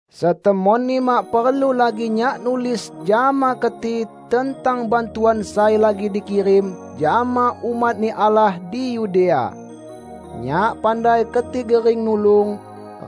Setemonni mak perlu lagi nyak nulis jama keti tentang bantuan sai lagi dikirim jama umat-Ni Allah di Yudea. Nyak pandai keti gering nulung,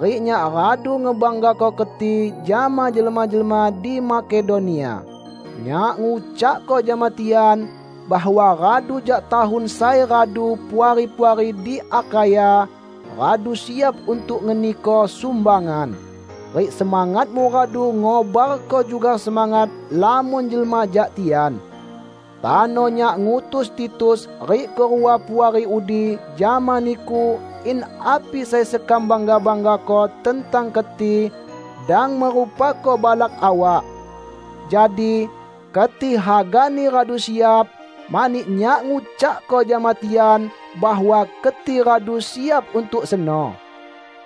rik nyak radu ngebanggako keti jama jelma-jelma di Makedonia. Nyak ngucakko jama tian, bahwa radu jak tahun sai radu puari-puari di Akhaya radu siap untuk ngeniko sumbangan. Rik semangatmu radu ngobarko juga semangat lamon jelma jak tian. Tano nyak ngutus Titus rik kerua puari udi jama niku in api sai sekam bangga-banggako tentang keti dang merupako balak awak. Jadi, keti hagani radu siap, mani nyak ngucakko jama tian bahwa keti radu siap untuk seno.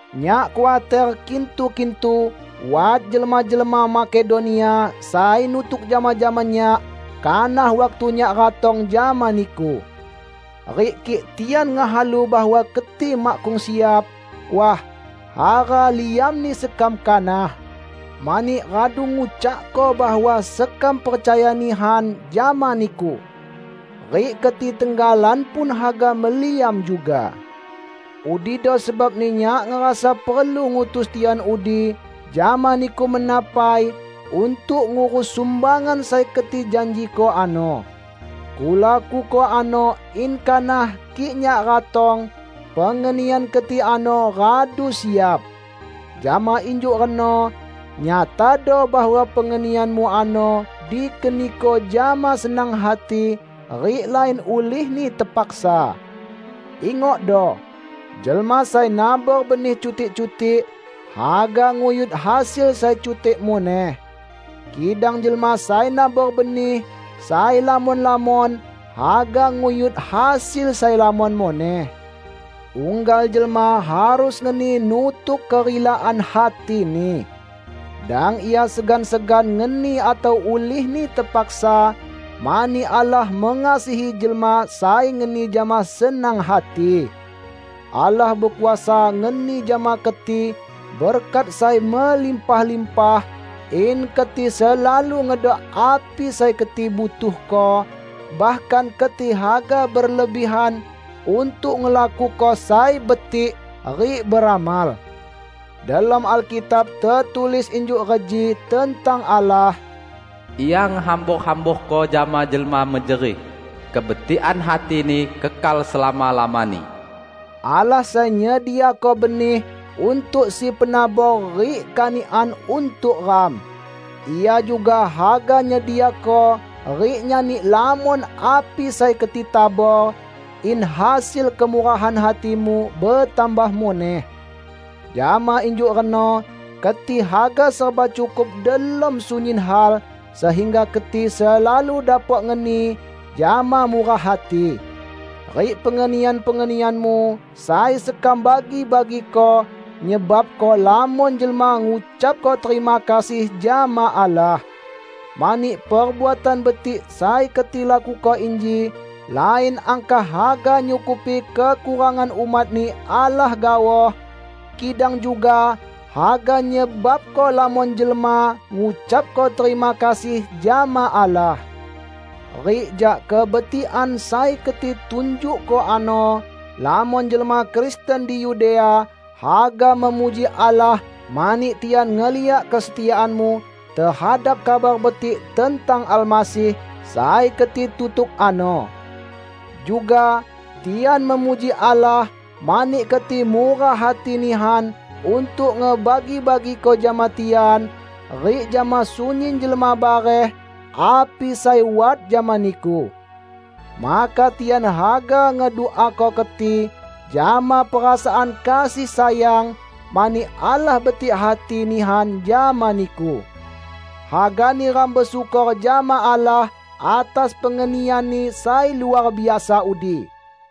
Nyak khuater kintu-kintu wat jelma-jelma Makedonia sai nutuk jama-jama nyak kanah waktu nyak ratong jama niku. Rik kik tian ngehalu bahwa keti makkung siap, wah, hara liamni sekam kanak, mani radu ngucakko bahwa sekam percaya nihan jama niku! Rik keti tenggalan pun haga meliam juga. Udido sebabni nyak ngerasa perlu ngutus tian udi jama niku mena pai untuk ngurus sumbangan sai keti janjiko ano. Kulakuko ano in kanah kik nyak ratong, pengenian keti ano radu siap. Jama injuk reno, nyatado bahwa pengenianmu ano dikeniko jama senang hati, rik lain ulihni tepaksa. Ingokdo! Jelma sai nabor benih cutik-cutik haga nguyut hasil sai cutik muneh. Kidang jelma sai nabor benih sai lamon-lamon haga nguyut hasil sai lamon muneh. Unggal jelma harus ngeni nutuk kerilaan hatini. Dang ia segan-segan ngeni atau ulihni tepaksa, mani Allah mengasihi jelma sai ngeni jama senang hati. Allah bekuasa ngeni jama keti berkat sai melimpah-limpah, in keti selalu ngedok api sai keti butuhko; bahkan keti haga berlebihan untuk ngelakuko sai betik rik beramal. Delom Alkitab tetulis injuk reji tentang Allah, "Ia ngehambor-hamborko jama jelma mejerih; kebetikan hati-Ni kekal selama-lamani." Allah sai nyediako benih untuk si penabor rik kanikan untuk ram. Ia juga haga nyediako rik nyani lamon api sai keti tabor, in hasil kemurahan hatimu betambah muneh. Jama injuk reno keti haga serba cukup delom sunyin hal sehingga keti selalu dapok ngeni jama murah hati. Rik pengenian-pengenianmu sai sekam bagi-bagiko, nyebabko lamon jelma ngucapko terima kasih jama Allah. Mani perbuatan betik sai keti lakuko inji lain angkah haga nyukupi kekurangan umat-Ni Allah gaoh, kidang juga haga nyebabko lamon jelma ngucapko terima kasih jama Allah. Rik jak kebetikan sai keti tunjukko ano, lamon jelma Kristen di Yudea haga memuji Allah mani tian ngeliak kesetiaanmu tehadap Kabar Betik tentang Almasih sai keti tutuk ano. Juga, tian memuji Allah, mani keti murah hati nihan untuk ngebagi-bagiko jama tian rik jama sunyin jelma bareh api sai wat jama niku. Maka tian haga ngeduako keti jama perasaan kasih sayang mani Allah betik hati nihan jama niku. Hagani ram besyukor jama Allah atas pengenian-Ni sai luar biasa udi!